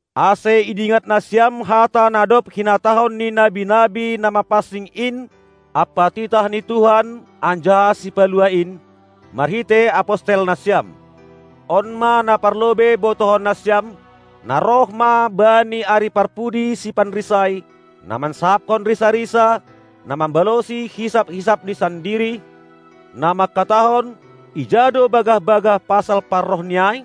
ase idingat nasiam hata na dob hinatahon ni nabi-nabi na mapansing in ampa titah ni Tuhan anjaha Sipaluah in marhitei apostel nasiam. On ma na parlobei botohon nasiam; Na roh ma bani ari parpudi sipanrisai, na mansahapkon risa-risa, na mambalosi hisap-hisapni sandiri, na mangkatahon: Ija do bagah-bagah pasal parrohni ai?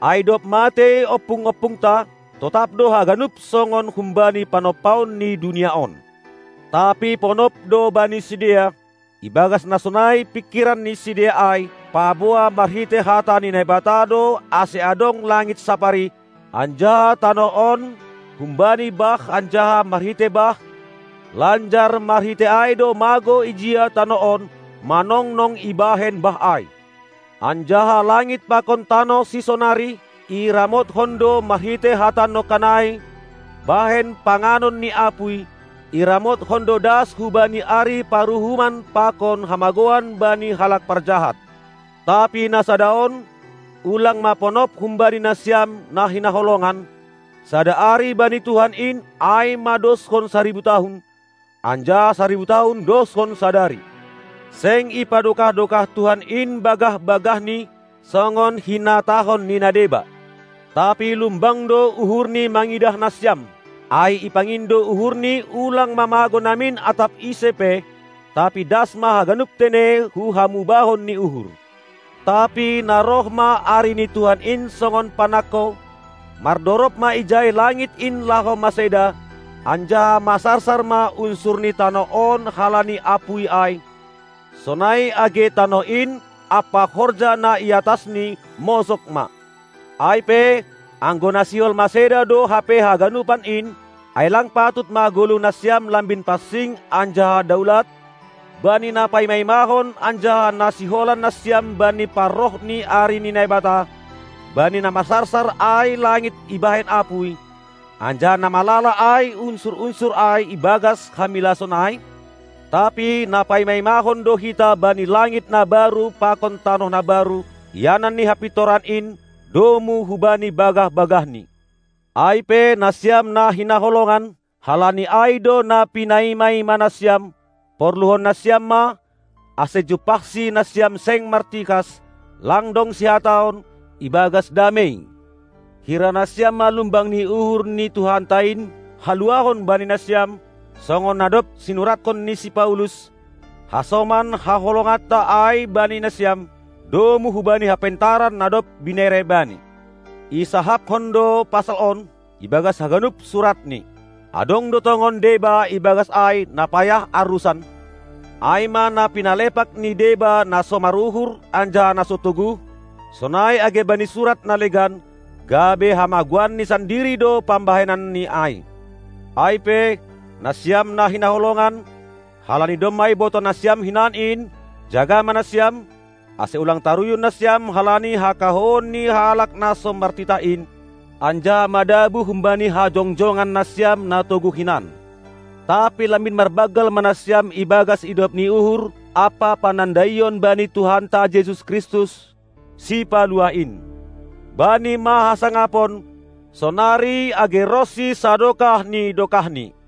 Ai dob matei ompung-ompungta, totap do haganup songon humbani panompaon ni dunia on. Tapi ponop do bani sidea, ibagas na sonai pingkiran ni sidea ai, paboa marhitei hata ni Naibata do ase adong langit sapari, anjaha tanoh on humbani bah anjaha marhitei bah, lanjar marhitei ai do magou ijia tanoh on, manongnong ibahen bah ai. Anjaha langit pakon tanoh sisonari, iramothon do marhitei hata nongkan ai bahen panganon ni apuy, iramothon do das hubani ari paruhuman pakon hamagouan bani halak parjahat. Tapi na sada on, ulang ma ponop humbani nasiam, na hinaholongan: Sada ari bani Tuhan in ai ma doshon saribu tahun, anjaha saribu tahun doshon sadari. Seng ipadokah-dokah Tuhan in bagah-bagahNi, songon hinatahon ni na deba; tapi lumbang do uhurNi mangidah nasiam, ai ipangindo uhurNi ulang ma magou namin atap ise pe, tapi das ma haganup tene hu hamubahon ni uhur. Tapi na roh ma ari ni Tuhan in songon panangko; mardorob ma ijai langit in laho maseda, anjaha masarsar ma unsur ni tanoh on halani apuy ai: sonai age tanoh in ampa horja na i atasni mosog ma. Ai pe, anggo na sihol maseda do hape haganupan in, ai lang patut ma goluh nasiam lambin pansing anjaha daulat, bani na paima-imahon anjaha na siholan nasiam bani parroh ni ari ni Naibata, bani na masarsar ai langit ibahen apuy, anjaha na malala ai unsur-unsur ai ibagas hamilason ai? Tapi na paima-imahon do hita bani langit na baru pakon tanoh na baru, ianan ni hapintoran in, domu hubani bagah-bagahNi. Ai pe, nasiam na hinaholongan, halani ai do na pinaima-ima nasiam, porluhon nasiam ma, ase jumpahSi nasiam seng martikas, lang dong sihataon, ibagas damei. Hira nasiam ma lumbang ni uhur ni Tuhanta in haluahon bani nasiam, songon na dob sinurathon ni si Paulus, hasoman haholonganta ai bani nasiam, domu hubani hapentaran na dob binere bani. Isahapkon do pasal on, ibagas haganup suratni. Adong do tongon deba ibagas ai na payah arusan; ai ma na pinalepak ni deba na so maruhur anjaha na so toguh, sonai age bani surat na legan; gabe hamagouanni sandiri do pambahenanni ai. Ai pe, nasiam na hinaholongan, halani domma ibotoh nasiam hinan in, jaga ma nasiam, ase ulang taruyun nasiam halani hakahouon ni halak na so martitah in, anjaha madabuh humbani hajongjongan nasiam na toguh hinan. Tapi lambin marbanggal ma nasiam ibagas idop ni uhur ampa panandaion bani Tuhanta Jesus Kristus, Sipaluah in. Bani ma hasangapon, sonari age ronsi sadokah ni dokahni!